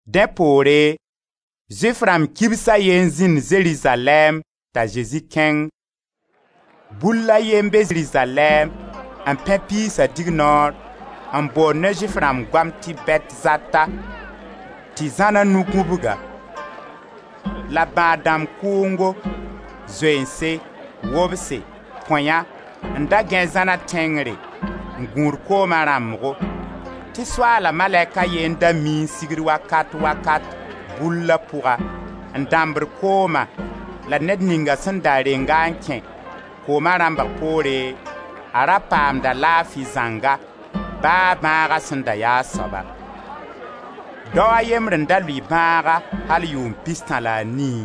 Dẽ poore, Zʋɩf rãmb kibs a ye n zĩnd Zerizalɛɛm t'a Zezi kẽng. Bull a ye n be Zerizalɛɛm, n pẽ piisa dignoor, n bond ne Zʋɩf rãmb goam tɩ Bɛtzata, tɩ zãn a nu gũbg-a. La bãad-dãmb kʋʋngo: zoeense, wobse, põya, n da gãe zãna tẽngre n gũud kooma rãmbgo, tɩ Soaala malɛk a ye n da miẽ n sigd wakat-wakat, bulla pʋga, n dãmbd kooma la ned ninga sẽn da reng-a n kẽ, kooma rãmbg poore, ra paamd-a laafi zãnga, ba a bãaga sẽn da ya a soaba. Dao a yembr n da lʋɩ bãaga al yʋʋm pistã la a nii.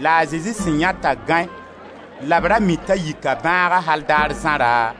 La a Zezi sẽn yãe t'a gãe la b ra mi t'a yika bãaga al daar zãra,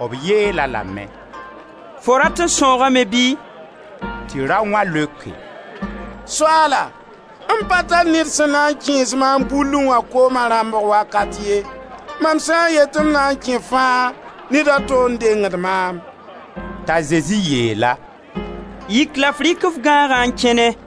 b yeel-a lame: «Fo rat n sãoogame bɩ?» Tɩ raoã leoke: «Soaala m pa tar ned sẽn na n kẽes maam bullẽ wã kooma rãmbg wakat ye, mam sã n yet tɩ m na n kẽ fãa, ned a to n dengd maam.» T'a Zezi yeel-a: «Yik la f rɩk f gãagã n kẽne.»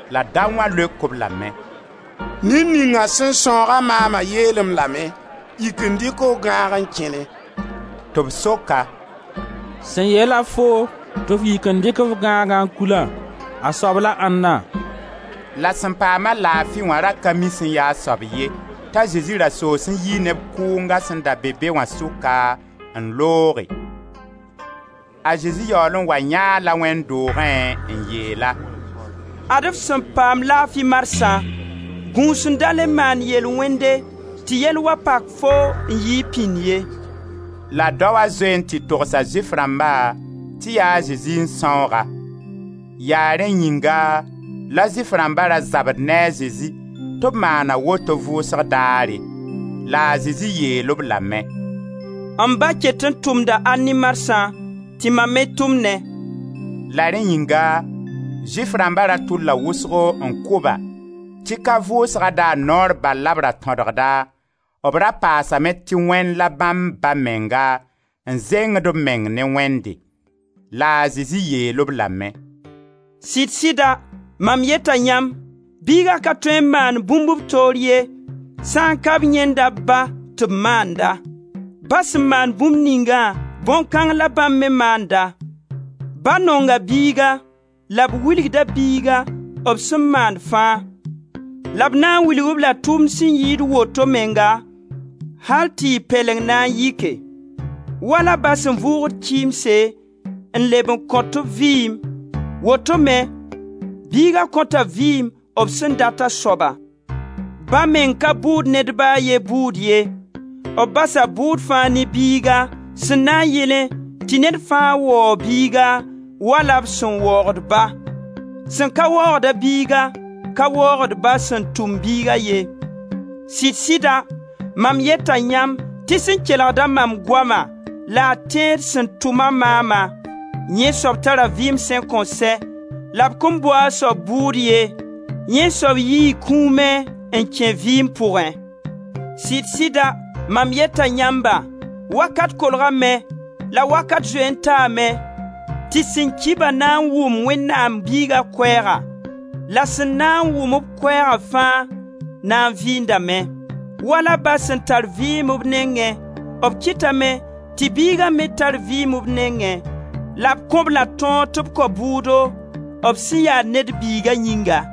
La daoã leok-b lame: «Ned ninga sẽn sãooga maama yeel-m lame: ‹Yik n dɩk f gãag n kẽne.›» Tɩ b sok-a: «Sẽn yeel-a foo tɩ f yik n dɩk f gãagã n kulã, a soab la ãnna?» La sẽn paam-a laafi wã ra ka mi sẽn ya a soab ye, t'a Zezi ra soos n yi neb kʋnga sẽn da be be wã sʋka n looge. A Zezi yaool n wa yãe-a-la wẽnd doogẽ n yeel-a: «Ad-f sẽn paam laafi marsã, gũs n da le maan yel-wẽnde tɩ yell wa pak foo n yɩɩg pĩnd ye.» La daoa zoe n tɩ togsa Zʋɩf rãmba tɩ ya a Zezi n sãoog-a. Yaa rẽnd yĩnga la Zʋɩf rãmba da zabd ne a Zezi tɩ b maana woto vʋʋsg daare. La a Zezi yeel-b lame: «M Ba ket n tʋmda al ne marsã, tɩ mam me tʋmnẽ.» La rẽ yĩnga Zʋɩf rãmba ra tʋlla wʋsgo n kʋ-ba, tɩ ka vʋʋsga daar noor bal la b ra tõdgda, b ra paasame tɩ Wẽnd la bãmb Ba menga, n zengd b meng ne Wẽnde. La a Zezi yeel-b lame: «Sɩd-sɩda, mam yeta yãmb: Biiga ka tõe n maan bũmb b toor ye, sã n ka b yãenda b Ba tɩ b maanda. Ba sẽn maan bũmb ningã, bõn-kãng la bãmb me maanda. Ba nonga Biiga, la b wilgda Biiga b sẽn maand fãa, la b na n wilg-b-la tʋʋm sẽn yɩɩd woto menga al tɩ y pɛleng na n yɩke. Wala Ba sẽn vʋʋgd kɩɩmse n leb n kõt-b vɩɩm, woto me Biiga kõta vɩɩm b sẽn dat a soaba Ba meng ka bʋʋd ned ba a ye bʋʋd ye, b basa bʋʋd fãa ne Biiga, sẽn na yɩlẽ tɩ ned fãa waoog Biiga, wala b sẽn waoogd Ba. Sẽn ka waoogd-a Biiga, ka waoogd Ba sẽn tʋm Biiga ye. Sɩd-sɩda, mam yeta yãmb tɩ sẽn kelgd-a mam goama, la a tẽed sẽn tʋma maama, yẽ soab tara vɩɩm sẽn kõn sɛ la b kõn bʋ a soab bʋʋd ye; yẽ soab yii kũumẽ n kẽ vɩɩm pʋgẽ. Sɩd-sɩda, mam yeta yãmba: wakat kolgame, — la wakat zoe n taame — tɩ sẽn ki-ba na n wʋm Wẽnnaam Biiga koɛɛga, la sẽn na n wʋm-b koɛɛga fãa na n vɩɩndame. Wala Ba sẽn tar vɩɩm b nengẽ, b kɩtame tɩ Biigã me tar vɩɩm b nengẽ la b kõ-b-la tõog tɩ b kao bʋʋdo b sẽn ya Ned Biiga yĩnga.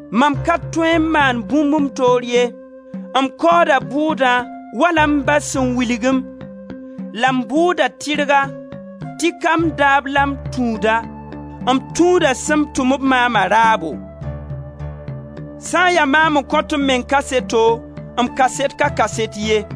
Mam ka tõe n maan bũmb m toor ye, m kaooda bʋʋdã wala m Ba sẽn wilg-m, la m bʋʋda tɩrga tɩ ka m daab la m tũuda, m tũuda sẽn tʋm-b maama raabo. Sã n ya maam n kõt m meng kaseto, m kaset ka kaset ye.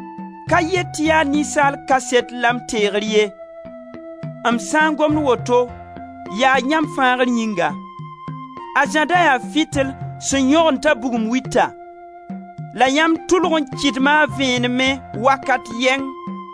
Ka yet tɩ yaa ninsaal kaset la m teegr ye; m sã n gomd woto, yaa yãmb fãagr yĩnga. A Zã da yaa fitil sẽn yõgen t'a bugum wita, la yãmb tʋlg n kɩdma a vẽenemẽ wakat yɛng.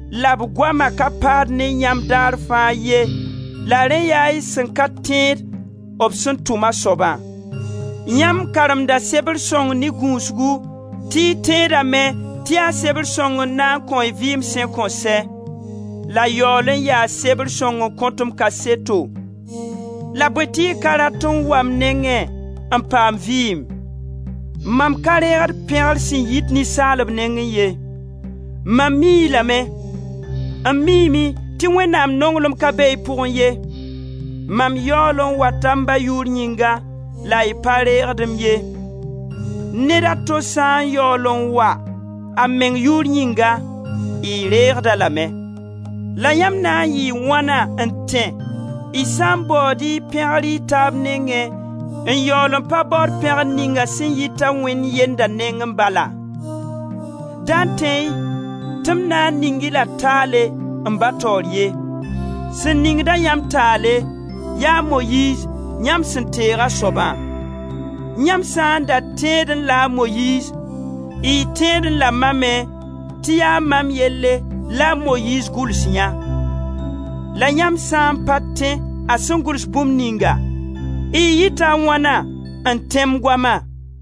la b goama ka paad ne yãmb daar fãa ye, la rẽ yaa y sẽn ka tẽed b sẽn tʋm a soabã. Yãmb karemda Sebr sõng ne gũusgu, tɩ y tẽdame tɩ yaa sebr sõng n na n kõ-y vɩɩm sẽn kõn sɛ, la yaool yaa sebr sõng n kõt-m kaseto, la bõe tɩ y ka rat n wa m nengẽ, n paam vɩɩm! Mam ka reegd pẽgr sẽn yit ninsaalb nengẽ ye. Mam mii-y lame: m miime tɩ Wẽnnaam nonglem ka be y pʋgẽ ye. Mam yaool n wata m Ba yʋʋr yĩnga la y pa reegd-m ye. Ned a to sã n yaool n wa a meng yʋʋr yĩnga, y reegd-a lame. La yãmb na n yɩɩ wãna n tẽ, y sã n baood y pẽgr y taab nengẽ n yaool n pa baood pẽgr ninga sẽn yita Wẽnd yenda nengẽ balã? Da tẽ-y tɩ m na n ning-y la taale, m Ba taoor ye. Sẽn ningd-a yãmb taale, ya a Moyiiz, yãmb sẽn teeg a soabã. Yãmb sã n da tẽedẽ-la a Moyiiz, y tẽedẽ-la mam me, tɩ yaa mam yelle la a Moyiiz gʋls yã. La yãmb sã n pa tẽ a sẽn gʋls bũmb ningã, y yɩta a wãna n tẽ m goma?»